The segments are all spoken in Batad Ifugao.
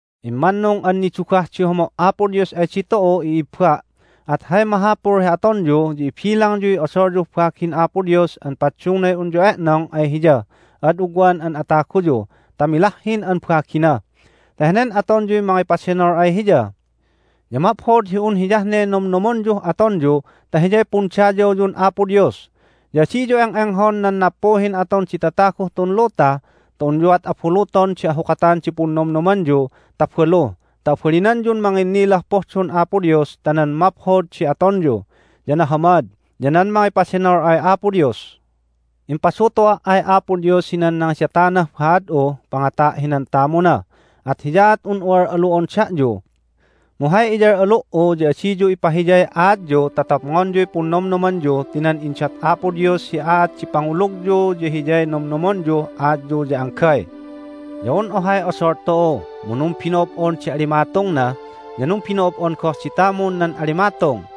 Immannung an nidugah di homo' Apo Dios ay ditu'u, i'ibba! At hay mahapul hi atonyu ya ibilangyuy odolyuh bagin Apo Dios an paddungnay unyu e'nong ay Hiyah ad ugwan an ataguyu ta milahhin an bagina, ta henen atonyuy mangipadenol ay Hiya. Ya maphod hi un hiyah ne nomnomonyuh atonyu ta hiyay pundayawyun Apo Dios. Ya adiyu eng'enghon nan nappuhin aton di tataguh tun luta ta unyuat abuluton di ahukatan di punnomnomyu ta balu ta abalinanyun manginnilah pohdon Apo Dios ta nan maphod di atonyu, ya nahamad, ya nan mangipadenol ay Apo Dios. Impadutu'a' ay Apo Dios hinan nangidatanah haad'uh pangata' hinan tamuna, at hiyaat un'u al'alu'on da'yu. Mu hay iyal'alu"u ya adiyu ipahiyay aatyu ta topngonyuy punnomnomanyu ti nan indat Apo Dios hi aat di pangulugyu ya hiyay nomnomonyuh aatyu ya anggay. Ya un ohay odol tu'u, mu numbino'ob'on di alimatungna, ya numbino'ob'on goh di tamun nan alimatung.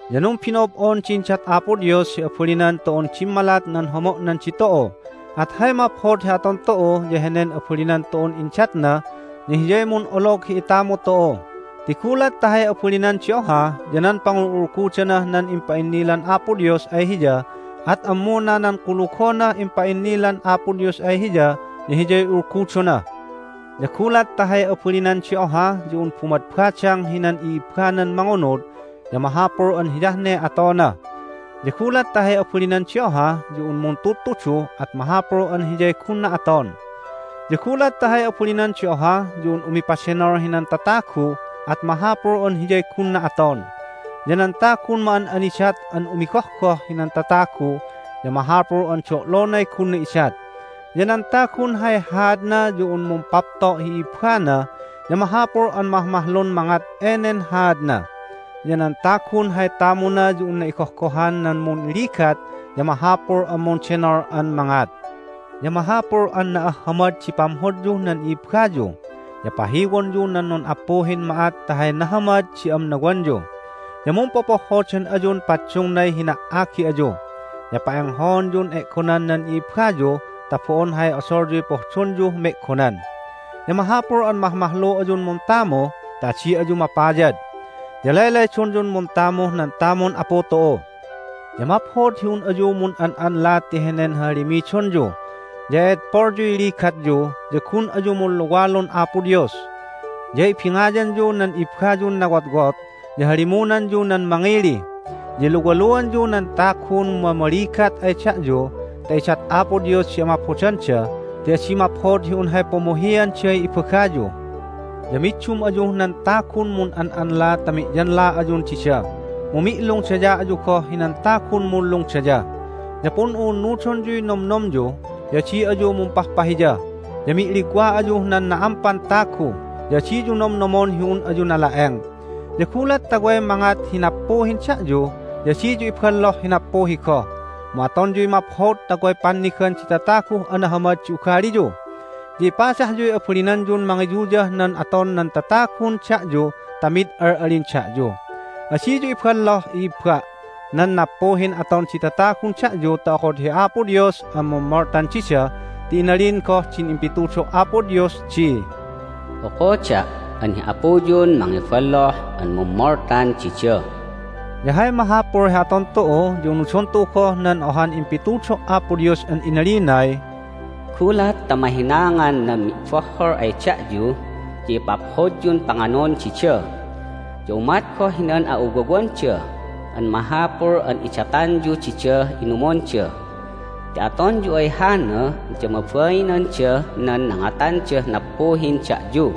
Ya numbino'ob'on di indat Apo Dios hi abalinan tu'un dimmalat nan homo'nan ditu'u. At hay maphod hi aton tu'u ya henen abalinan tu'un indatna ya hiyay mun'olog hi itamu tu'u. Ti gulat ta hay abalinan di oha ya nan pangul'ulgudanah nan impa'innilan Apo Dios ay hiya at ammuna nan kulugonah impa'innilan Apo Dios ay hiya ya hiyay ulgudona. Ya gulat ta hay abalinan di oha ya un bumadbadang hinan i'ibbanan mangunud ya mahapul an hiyah ne atona. Ya gulat ta hay abalinan di oha ya un muntudtudu at mahapul an hiyay gunna aton. Ya gulat ta hay abalinan di oha ya un umipadenol hinan tatagu at mahapul an hiyay gunna aton. Ya nan tagun ma'an'anidat an umigohgoh hinan tatagu ya mahapul an do'lonay gunna idat. Ya nan tagun hay haadna ya un mumpapto' hi i'ibbana ya mahapul an mahmahlun mangat enen haadna. Ya nan tagun hay tamuna ya unna igohgohan nan munligat ya mahapul an mundenol an mangat. Ya mahapul an na'ahhamad di pamhodyuh nan i'ibbayu. Ya pahiwonyu nan nun'appuhin ma'at ta hay nahamad di amnawanyu. Ya mumpopohhodan ayun paddungnay hina"agi ayu. Ya pa'enghaonyun e'gonan nan i'ibbayu ta bo'on hay odolyuy pohdonyuh me'gonan. Ya mahapul an mahmahlu ayun muntamu ta adi ayu mapayad. Ya laylaydonyun muntamuh nan tamun Apu tu'u. Ya maphod hi un ayu mun'an'anla ti henen hahalimidonyu. Ya e'edpolyuy ligatyu, ya gun ayu munluwalun Apo Dios. Ya ibingayanyu nan ibbayun nawotwot, ya halimunanyu nan mangili. Ya iluwaluanyu nan tagun mamaligat ay da'yu ta idat Apo Dios di amaphodanda ti adi maphod hi un hay pumuhianday ibagayu. Ya middum ayuh nan tagun mun'an'anla ta mi'yanla ayun dida, mu mi'lungdaya ayu goh hinan tagun munlungdaya. Ya pun'u'unnudonyuy nomnomyu, ya adi ayu mumpahpahiya, ya mi'ligwa ayuh nan na'ampan tagu. Ya adiyu nomnomon hi un ayu nala'eng. Ya gulat ta way mangat hi nappuhin da'yu ya adiyu iballoh hi nappuhi goh, mu atonyuy maphod ta way pannigan di tataguh anahamad di ugaliyu. Ya ipadahyuy abalinanyun mangiyuyah nan aton nan tatagun da'yu ta mid al'alin da'yu. Adiyu iballoh, i'ibba', nan nappuhin aton di tatagun da'yu ta okod hi Apo Dios an mummoltan dida ti inalin goh din impitudo' Apo Dios di, "Okoda' an hi Apuyun mangiballoh an mummoltan dida." Ya hay mahapul hi aton tu'u ya unudon tu'u goh nan ohan impitudo' Apo Dios an inalinay, "Gulat ta mahinaangan nan mi'bohhol ay da'yu ya ipaphodyun panganon dida. Ya umat goh hinan a'uwawanda an mahapul an idatanyu didah inumonda. Ti atonyu ay hana ya mabainandah nan nangatandah nappuhin da'yu."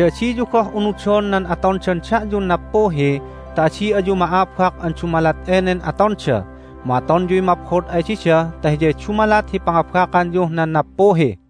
Ya adiyu goh unudon nan atondan da'yun nappuhi ta adi ayu ma'abak an dumalat enen atonda. Mu atonyuy maphod ay dida ta hiyay dumalat hi pangabakanyuh nan nappuhi.